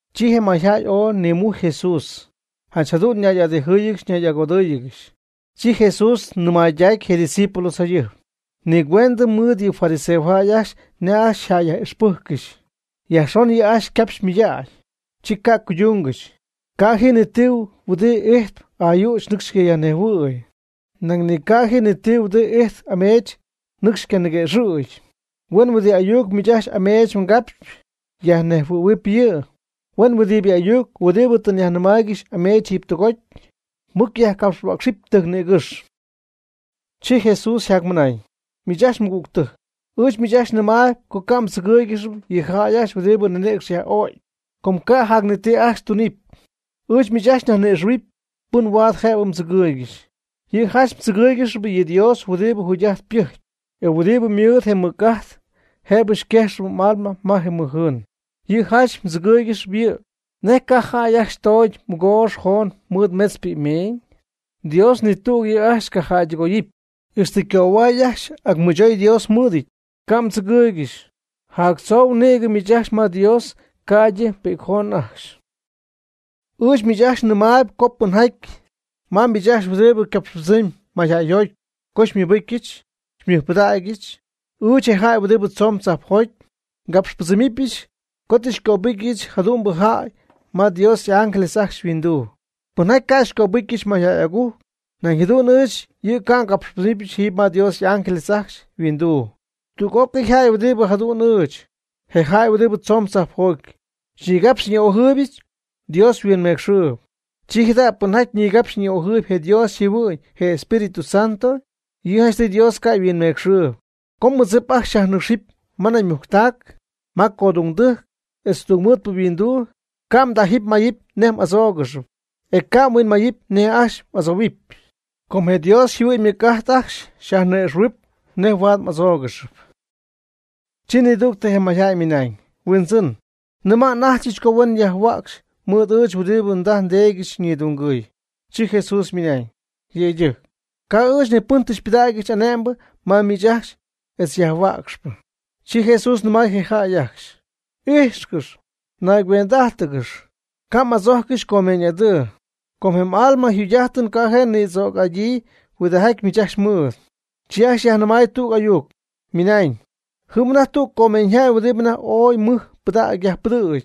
Chi je mayjäy ooy nimujcy Jesús, janch jadu'n ñay'adijɨy ñay'agodɨ́ɨyɨgɨxy, chi Jesús nɨmaydacy je' ydiscípulos jayɨjp: ―Nigüendɨ mɨɨd yɨ fariseojäy ajcxy nej ajcxy yjäyyaj'ixpɨ́jccɨxy. Yajxon yɨ' ajcxy ycapxy ymɨydägy, chi ca' cuydungɨxy. Ca' ji ti huɨdi ijtp ayüch nɨcxy ycayajnejhuɨ̈y, nañ ni ca' ji ti huɨdi ijtp ameech nɨcxy ycaniguëxɨ̈gy. Huen huɨdi ayuc miich ajcxy ameech mgapxy, yajnejhuɨ̈huɨp yɨ'. Huen huɨdibɨ ayuc huɨdi tɨ mnayyajnɨmáayɨgɨxy ameech jiiby tɨgoty, mɨc yajcapxhuäcxɨp tɨjc nïgɨ́xy. Chi Jesús yjacmɨnañ: ―Miich ajcxy nmɨgügtɨjc, ɨɨch miich ajcxy nɨmaayb co ca' mdzɨgɨɨygɨxy yɨ jäy ajcxy huɨdibɨ ninïcx yaj'o'cp, com ca' jac ni ti ajcxy tunɨpy. Ɨɨch miich ajcxy nyajni'ixɨ̈huɨpy pɨn huaad jëbɨ mdzɨgɨɨygɨxy. Yɨ' janch mdzɨgɨɨygɨxy yɨ Dios huɨdibɨ jugy'ajt pɨjcp, e huin'it mɨɨd je' ymɨc'ajt jëbɨ quexɨpy m'alma ma je mɨj jɨɨn. Yɨ' janch mdzɨgɨɨygɨxy yɨ'. ¿Nej ca' jäy ajcxy ytoogyii mɨgoox joon mɨɨd metz pi'cmeeñ? Dios ni tüg yɨ' ajcxy ca' jäydɨgooyɨty. Ixtɨ mgöhuay ajcxy ac mɨchoy Dios mɨɨdɨty. Ca' mdzɨgɨɨygɨxy, jactzou nïgɨ miich ajcxy ma Dios ca'ydɨ pi'cjoon ajcxy. Ɨɨch miich ajcxy nɨmaayb co pɨnjaty ma miich ajcxy huɨdi capxpɨdzɨmp mayjäyjoty co xymɨbɨ́cyɨch xymɨjpɨdägyɨch, ɨɨch, je jäy huɨdi tzoon tzajpjoty, ngapxpɨdzɨmɨpyɨch co tɨ ngöbɨcyɨch jadu'mbɨ jäy ma Dios y'ángeles ajcxy yhuinduu. Pɨnjaty ca' xycöbɨcyɨch mayjäy'agujc, nañ jadu'n ɨɨch yɨ' ca' ngöbɨgɨpyɨch jiiby ma Dios y'ángeles ajcxy yhuinduu. Tüg'ócɨy jäy huɨdi jadu'n ɨɨch, je jäy huɨdi tzoon tzajpjoty, xyñigapxp xyñi'ojɨɨybɨch Dios huinmecxɨɨb. Chi jada' pɨnjaty nigapxp ni'ojɨɨyb je' Dios yjɨhuɨ'ñ (je Espíritu Santo), yɨ' janchtɨy Dios ca' yhuinmecxɨɨyb. Co mmɨdzip ajcxy xyajnɨ́cxɨp ma naymujctac, ma codungdɨjc, etz tungmɨɨdpɨ yhuinduu, ca' mdájɨp mmáyɨp nej m'adzóogɨxɨpy, e ca' mhuinmayɨpy nej ajcxy m'adzohuɨpy. Com je Dios yjɨhuɨ'ñ huin'ítɨy ajcxy xyajni'ixɨ̈huɨp nej huaad m'adzoogɨxy. Chi nidügtɨ je mayjäy ymɨnañ: ―Huindzɨn, nɨma' n'ajchɨch co huen yajhuäcxy mɨɨd ɨɨch huɨdi ndaj ndeedyɨch ñidungɨy. Chi Jesús ymɨnañ: ―Yëydɨjc, ca' ɨɨch ni pɨn tɨ xypɨdägyɨch ane'mbɨ ma miich ajcxy etz yajhuäcxpɨ. Chi Jesús nɨmay je jäy ajcxy: ―Ijxcɨx naygüend'ájtɨgɨx, ca' m'adzojccɨxy comeeñ'adɨɨ, com je m'alma yjugy'ájtɨn ca' je' nïdzoocɨn'adyii huɨdijaty miich ajcxy mɨɨd. Chi ajcxy yajnɨmay tüg ayuc, ymɨnañ: ―Jɨm anajty tüg comeeñyjäy huɨdibɨ anajty ooy mɨj ypɨdägy yajpɨdɨ̈gy.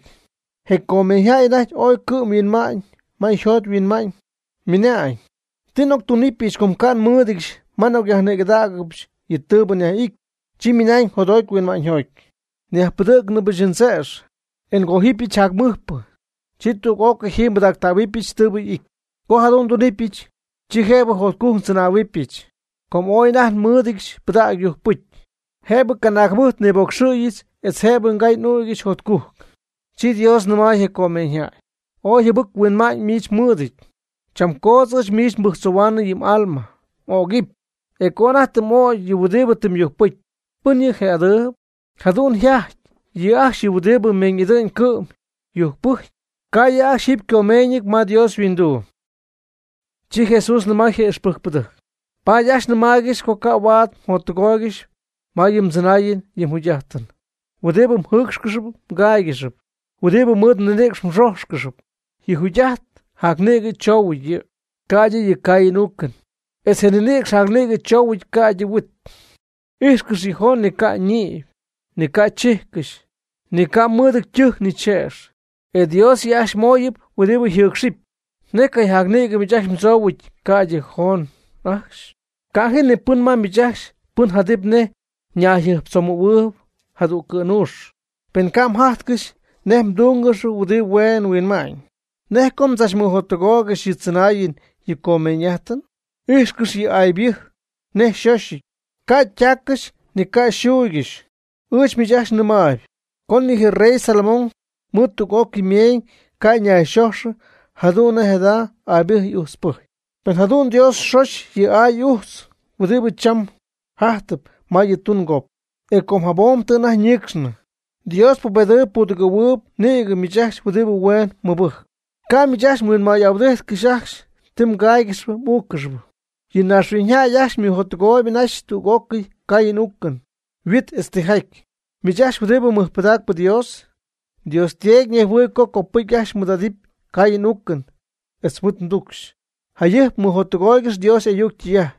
Je comeeñyjäy anajty ooy cɨ'm huinmay ma yjot yhuinma'ñ, ymɨnañ: “¿Ti n'octunɨpɨch com ca' nmɨ́ɨdɨdyɨch ma nyajnïgɨdägɨbɨch yɨ tɨɨbɨ y'ity?” Chi ymɨnañ jotjoty huinma'ñyjoty: “Nyajpɨdɨ̈cnɨbɨch ndzëx, e ngójɨbɨch jacmɨjpɨ, chi tüg'ócɨy jiiby nbɨdactähuɨbɨch tɨɨbɨ y'ity.” Co jadu'n ndunɨpyɨch, chi jëbɨ jotcujc ndzɨnähuɨbɨch, com ooy anajty nmɨ́ɨdɨdyɨch pɨdägy yujcpɨcy, jëbɨ canaag jɨmɨjt niboocxyɨch etz jëbɨ ngay n'ügyɨch jotcujc. Chi Dios nɨmay je comeeñyjäy: “Ooy jɨbɨc-huinma'ñ miich mɨɨdɨty. Cham coodz ɨɨch miich nibɨjctzohuɨ̈huaanɨy yɨ m'alma (m'ögɨp), e co anajty tɨ m'ögy yɨ huɨdibɨ tɨ myujcpɨcy, ¿pɨn yɨ' je'adɨɨb?” Jadu'n yjajty yɨ' ajcxy huɨdibɨ ymeeñ'idɨ'ñ cɨ'm yujcpɨjcp, ca' yɨ' ajcxy jiiby ycomeeñyɨty ma Dios yhuinduu. Chi Jesús nɨmay je y'ixpɨjcpɨdɨjc: ―Paady ajcxy nɨmaaygɨxy co ca' huaad mjottɨgooygɨxy ma yɨ mdzɨnáayɨn yɨ mjugy'ájtɨn, huɨdi mjɨ́ɨcxcɨxɨpy mgáaygɨxɨpy, huɨdi mɨɨd mninïcx mxójxcɨxɨpy. Yɨ jugy'ajt jacnïgɨ tzou yɨ', ca'ydɨ yɨ caayɨn uucɨn, etz je mninïcx jacnïgɨ choohuɨty ca'ydɨ huit. Ijxcɨx yɨ joogy ni ca' ñïpy, ni ca' chijccɨxy, ni ca mɨɨdɨty ytɨjc ni chëx, e Dios yɨ' ajcxy mooyɨpy huɨdi yjɨɨcxcɨxyp, ¿nej cayjacnïgɨ miich ajcxy mdzoohuɨty ca'ydɨ joon ajcxy? Ca' ji ni pɨn ma miich ajcxy pɨn jadɨpy nej ñayjɨjptzomɨ̈huɨɨb jadüg cɨ̈nuux. Pen ca' mjajtcɨxy nej mdúngɨxɨpy huɨdi hueen huinma'ñ, ¿nej co mdzachmɨjottɨgooygɨxy yɨ tzɨnaayɨn yɨ comeeñ'ájtɨn? Ijxcɨx yɨ aaybɨjy nej xóxyɨty, ca' ytaaccɨxy ni ca' yxuuygɨxy. Ɨɨch miich ajcxy nɨmaayb, co ni je rey Salomón mɨɨd tüg'ócɨy ymeeñ ca' ñayxojxɨ jadu'n nej jada aaybɨjy ujtzpɨjy. Pen jadu'n Dios xoxy yɨ aay yɨ ujtz huɨdibɨ cham jajtɨp ma yɨ tungop, e com jabom tɨ anajty ñiicxnɨ, Dios xypubedɨpy xypudɨgɨ̈huɨpy nïgɨ miich ajcxy huɨdi hueen mɨbɨjcp. Ca' miich ajcxy mhuinmay'ahuɨdíjtcɨxɨpy ajcxy ti mgáaygɨxɨpy m'úuccɨxɨpy. Yɨ naaxhuiñyjäy ajcxy ymɨjottɨgoyb anaxy tüg'ócɨy caayɨn uucɨn, huit etz tijaty. Miich ajcxy huɨdi mɨjpɨdacp Dios, Dios Teedy ñejhuɨɨyb co copɨcy ajcxy mɨɨd'adɨpy caayɨn uucɨn etz huit tucxy. Jayɨjp mɨjottɨgooygɨx Dios y'ayuc ytɨy'ajt,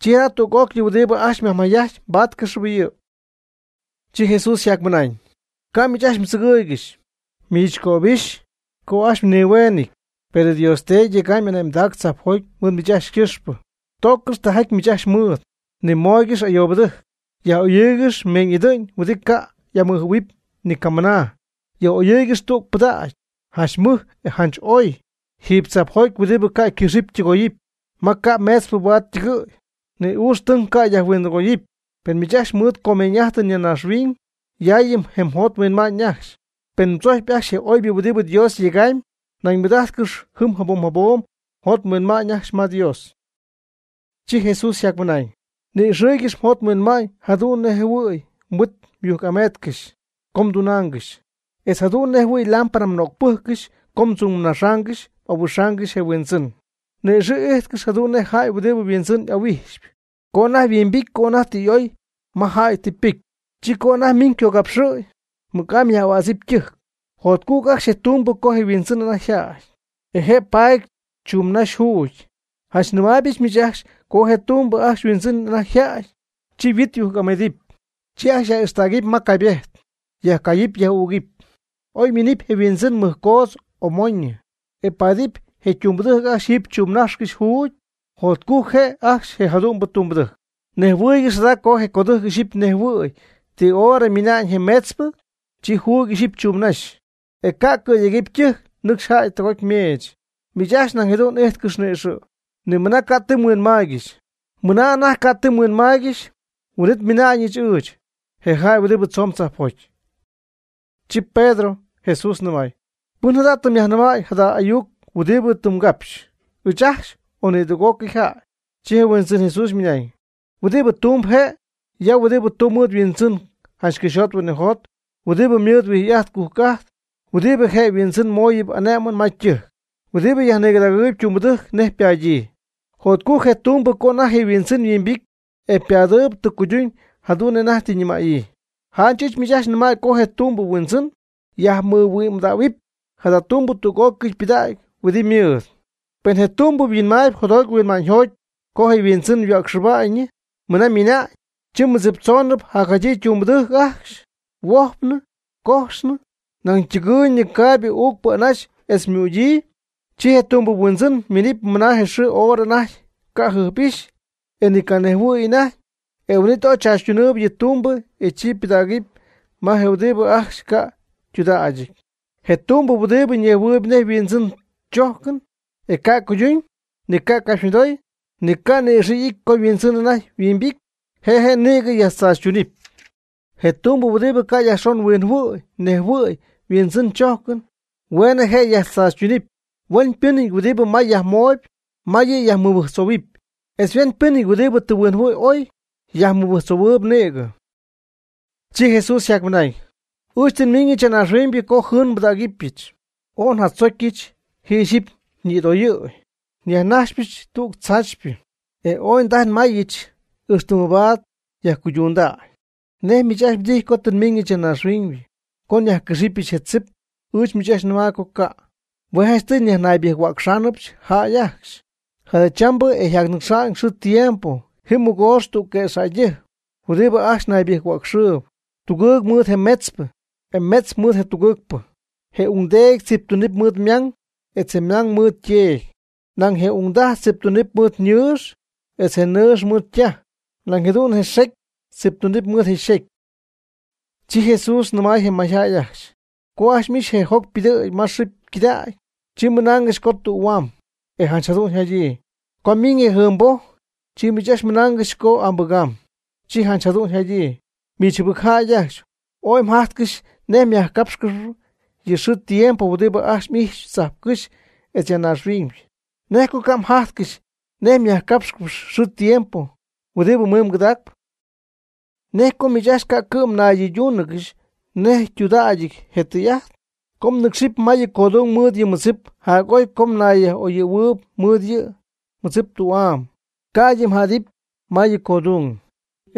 chi jada' tüg'ócɨy huɨdi ajcxy myajmayjajty mbáatcɨxɨpy yɨ'. Chi Jesús yjacmɨnaañ: ―Ca' miich ajcxy mdzɨgɨɨygɨxy, miich ajcxy mnihueeñɨty, per mDios Teedy yega'ñ ane'mdac tzajpjoty mɨɨd miich ajcxy ycɨxpɨ. Tooccɨx tijaty miich ajcxy mɨɨd, nimooygɨx ayoobɨtɨjc. Yaj'oyɨɨygɨx meeñ'idɨ'ñ huɨdi ca' y'amɨjɨ̈huɨpy ni camɨna. Yaj'oyɨɨygɨx tüg pɨdägy, janch mɨj e janch oy, jiiby tzajpjoty huɨdi ca' ycɨxɨpy ytɨgoyɨpy, ma ca' meetzpɨ huaad ytɨgɨ̈y, ni ucxytɨng ca' yajhuindɨgoyɨpy. Pen miich ajcxy mɨɨd mgomeeñ'ájtɨn ya naaxhuiñ, yaayɨ je mjot mhuinma'ñ ajcxy. Pen mdzojcpy ajcxy je oybɨ huɨdibɨ Dios yegamy, nañ mɨɨd'ájtcɨxy jɨm jabom jabom mjot mhuinma'ñ ajcxy ma Dios. Chi Jesús yjacmɨnañ: ―Ni'ixɨɨygɨx mjot mhuinma'ñ jadu'n nej jɨhuɨ̈y mhuit myujc'ameetcɨxy co mdunaangɨxy, etz jadu'n nej jɨhuɨ̈y lámpara mnögpɨjccɨxy co mdzumnaxaangɨxy m'ahuixaangɨxy je huindzɨn. Ni'ixɨ̈'ijtcɨx jadu'n nej jäy huɨdi yhuindzɨn ahuijxp, co anajty yhuimbity co anajty tɨ y'oy ma jäy tɨ ypɨcy, chi co anajty minɨpy ycogapxɨ̈y, mɨc'amy myaj'ahuädzɨty ytɨjc. Jotcujc ajcxy je tumbɨ co je yhuindzɨn anajty yjädy, e paady chumnajx juugy. Janch nɨmaaybɨch miich ajcxy co je tumbɨ ajcxy yhuindzɨn anajty yjädy, chi yhuit yujc'ameedɨpy, chi ajcxy yaj'ixtägɨpy ma caybejt, yajcayɨpy yaj'ügɨpy. Oy miinɨpy je huindzɨn mɨjcoodz o moñyɨ, e páadɨp je tumbɨdɨjc ajcxy jɨm chumnájxcɨxy juugy, jotcujc je' ajcxy je jadu'mbɨ tumbɨdɨjc. Nejhuɨɨygɨx jada co je codɨjc ixyipy nejhuɨ̈huɨpy ti hora ymina'ñ je meetzpɨ, chi juugy ixyipy chuumnaxa'ñ, e ca' cɨ̈yegɨpy ytɨjc nɨcxy jäy tɨgoty ymeech. Miich ajcxy nañ jadu'n íjtcɨxy ni'ixɨ', mɨna anajty ca' ti mhuinmaaygɨxy, huin'it miina'ñɨch ɨɨch, je jäy huɨdi tzoon tzajpjoty. Chi Pedro Jesús nɨmay: ―¿Pɨn jada tɨ myajnɨmaayb jada ayuc huɨdi tɨ mgapxy, ɨɨch ajcxy, o nidüg'ócɨy jäy? Chi je Huindzɨn Jesús ymɨnañ: ―Huɨdibɨ tumbɨ je' ya huɨdi tumb mɨɨd yhuindzɨn janch cɨxyjot huinɨjot huɨdi mɨɨd yhuijy'ajt ycujc'ajt huɨdi je yhuindzɨn mooyɨp ané'mɨn ma ytɨjc, huɨdi yajnigɨdägɨɨyb tumbɨdɨjc nej ypaadyii. Jotcujc je tumbɨ co anajty je' yhuindzɨn yhuimbity e padɨɨyb tɨ cuyduñ jadu'n nej anajty tɨ ñɨmäyii. Janch ɨɨch miich ajcxy nɨmäy co je tumbɨ huindzɨn yajmɨhuɨ'mdähuɨpy jada ytumbɨ tüg'ócɨy pɨdägy huɨdi ymɨɨd. Pen je tumbɨ yhuinmaayb jotjoty huinma'ñyjoty co je yhuindzɨn yhuäcxɨjpnɨ mɨna ymiina'ñ, chi mɨdziptzoonɨ jacjadyii tumbɨdɨjc ajcxy, huojpnɨ, cojxnɨ, nañ ytɨgɨɨyñɨ caayb uucp anaxy etz ymügyii. Chi je tumbɨ yhuindzɨn miinɨpy ma je xɨɨ hora anajty ca' jɨjp'ixy e ni canejhuɨy anajty, e huin'it ooy tzaachytunɨpy yɨ tumbɨ e chi pɨdägɨpy ma je huɨdi ajcxy ca' ytudägyɨty. Je tumbɨ huɨdi nejhuɨɨyb nej yhuindzɨn chójcɨn, e ca' cuyduñ, ni ca' ycapxymɨdoy, ni ca' ni'ixɨ' ity co yhuindzɨn anajty yhuimbity, je' je' nïgɨ yajtzaachytunɨp. Je tumbɨ huɨdi ca' yajxon huinjɨhuɨ̈y nejjɨhuɨ̈y yhuindzɨn chójcɨn, hueenɨ je' yajtzaachytunɨpy. Huenpɨ́nɨty huɨdi may yajmooyb, may yɨ' yajmɨbɨjctzohuɨɨyb; etz huenpɨ́nɨty huɨdi tɨ mɨhuɨ'my ooy, yajmɨbɨjctzohuɨɨb nïgɨ. Chi Jesús yjacmɨnañ: ―Ɨɨch tɨ nmiiñɨch ya naaxhuiñ co jɨɨn nbɨdägɨbɨch. ¡Ooy njadzocyɨch ji ixyipy ñitooyñɨ! Nyajnaxɨpyɨch tüg tzaachypɨ, e ¡ooy ndajy nmayɨch ixtɨ mabaad yajcuydundäy! ¿Nej miich ajcxy mdijy co tɨ nmiiñɨch ya naaxhuiñ co nyajcɨxɨpyɨch je tzipɨ? Ɨɨch miich ajcxy nɨmaayb co ca'. Hue' janchtɨy nyajnaybɨjc-huäcxáanɨbɨch jäy ajcxy. Jadachambɨ etz yjacnɨcxnɨ xɨɨ tiempo ji mɨgoox tüg quëxjäydɨjc huɨdibɨ ajcxy ñaybɨjc-huäcxɨɨb, tugɨɨg mɨɨd je metzpɨ, e metzpɨ mɨɨd je tugɨɨgpɨ. Je ungdeedy tziptunɨp mɨɨd ymang etz je mang mɨɨd yteedy. Nañ je ungdaj tziptunɨp mɨɨd yñɨɨx etz je nɨɨx mɨɨd ytaj. Nañ jadu'n je xecy tziptunɨp mɨɨd yxecy. Chi Jesús nɨmay je mayjäy ajcxy: ―Co ajcxy m'ixy je joc ypɨdɨ̈gy ma xɨɨ ycɨdägy, chi mɨnaangɨxy co tühuaam, e janch jadu'n yjadyii. Co ymiiñ je jɨɨnboj, chi miich ajcxy mɨnaangɨxy co ambɨgaamb, chi janch jadu'n yjadyii. ¡Miich jɨbɨc jäy ajcxy! Ooy mjajtcɨxy nej myajcapxcɨxy yɨ xɨɨ tiempo huɨdi ajcxy m'ijxpy tzajpcɨ́xy etz ya naaxhuiñ: ¿Nej co ca' mjajtcɨxy nej myajcápxcɨxɨpy xɨɨ tiempo ymiñ ycɨdägy? ¿Nej co miich ajcxy ca' cɨ'm mnaydɨydúunɨgɨxy nej ytudägyɨty je tɨy'ajt? Co mnɨ́cxɨpy ma yɨ codung mɨɨd yɨ mmɨdzip jac'oy co mnayyaj'oyɨ̈huɨpy mɨɨd yɨ mmɨdzip tü'am, ca'ydɨ mɨɨd mjädɨp ma yɨ codung,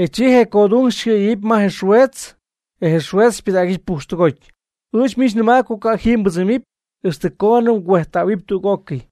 e chi je codung xycɨ̈yegɨpy ma je xueetz, e je xueetz xypɨdägɨp pujxtɨgoty. Ɨɨch miich nɨmaayb co ca' jiiby mbɨdzɨmɨpy, ixtɨ coonɨ mgüejttähuɨpy tüg'ócɨy.